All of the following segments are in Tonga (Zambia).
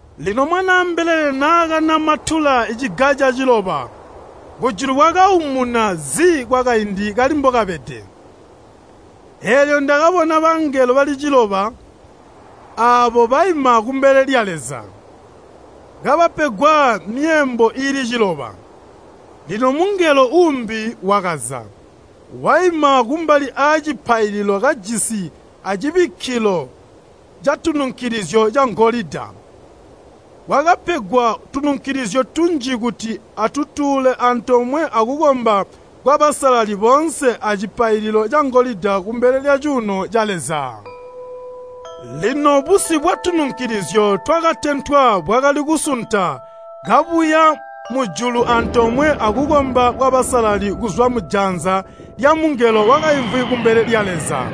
Lino Mwanaa mbelele naakanamatula ciga caciloba, kujulu kwakaumuna zi kwakaindi kali mbokabede. Eelyo ndakabona bangelo bali ciloba aabo baima kumbele lya Leza, kabapegwa myeembo iili ciloba. Lino mungelo uumbi, wakaza, waima kumbali aacipaililo kajisi acibikkilo catununkilizyo cangolida. Wakapegwa tununkilizyo tunji kuti atutuule antoomwe akukomba kwabasalali boonse acipaililo cangolida kumbele lyacuuno ca Leza. Lino busi bwatununkilizyo twakatentwa bwakali kusunta kabuya mujulu antoomwe akukomba kwabasalali kuzwa mujanza lyamungelo wakaimvwi kumbele lya Leza.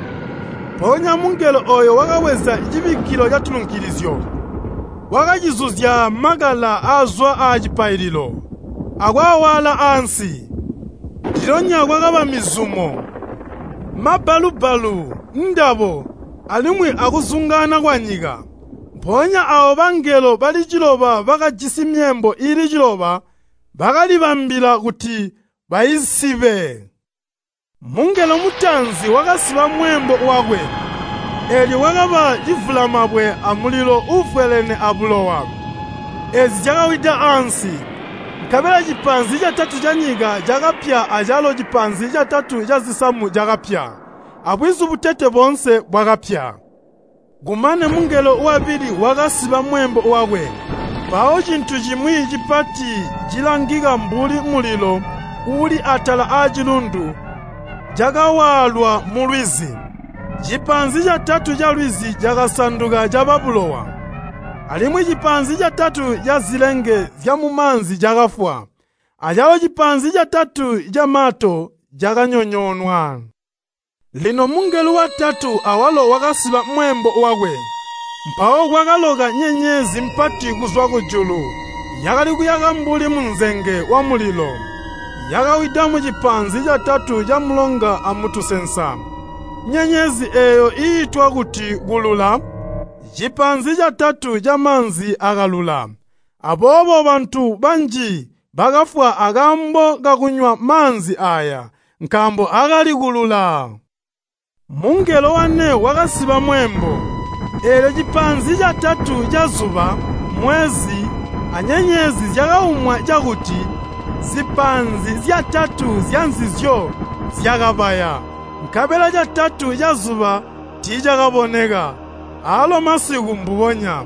Mpoonya mungelo ooyo wakabweza cibikkilo catununkilizyo, wakacizuzya makala aazwa aacipaililo, akwaawaala ansi. Ndilyonya kwakaba mizumo, mabbalu-bbalu, ndabo, alimwi akuzungaana kwanyika. Mpoonya aawo bangelo bali ciloba bakajisi myeembo iili ciloba bakalibambilila kuti baisibe. Mungelo mutaanzi wakasiba mweembo wakwe, eelyo kwakaba civulamabwe amulilo uuvwelene abulowa, eezi zyakawida ansi. Nkabela cipaanzi catatu canyika cakapya acalo cipaanzi catatu cazisamu cakapya, abwizu butete boonse bwakapya. Kumane mungelo wabili bakasiba mweembo wakwe. Mpawo cintu cimwi cipati cilangika mbuli mulilo uuli atala aacilundu cakawaalwa mulwizi. Cipaanzi catatu calwizi cakasanduka caba bulowa, alimwi cipaanzi catatu cazilenge zyamumaanzi cakafwa, acalo cipaanzi catatu camato cakanyonyoonwa. Lino mungelo watatu awalo wakasiba mweembo wakwe. Mpawo kwakaloka nyenyezi mpati kuzwa kujulu yakali kuyaka mbuli munzenge wamulilo, yakawida mucipaanzi catatu camulonga amutusensa. Nyenyezi eeyo iitwa kuti “Kulula.” Cipaanzi catatu camaanzi akalula, aboobo bantu banji bakafwa akaambo kakunywa maanzi aaya, nkaambo akali kulula. Mungelo wane wakasiba mweembo. Eelyo cipaanzi catatu cazuba, mwezi, anyenyezi zyakaumwa cakuti zipaanzi zyatatu zyanzizyo zyakabaya, nkabela catatu cazuba tiicakaboneka, aalo masiku mbubonya.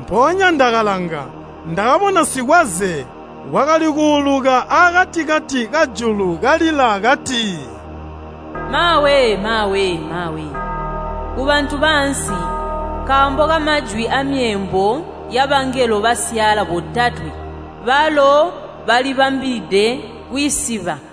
Mpoonya ndakalanga, ndakabona sikwaze wakali kuulukila akati-kati kajulu kalila kati, “Maawe! maawe! maawe! Kubantu baansi nkaambo kamajwi aamyeembo yabangelo basyaala botatwe balo balibambilide kwiisiba!”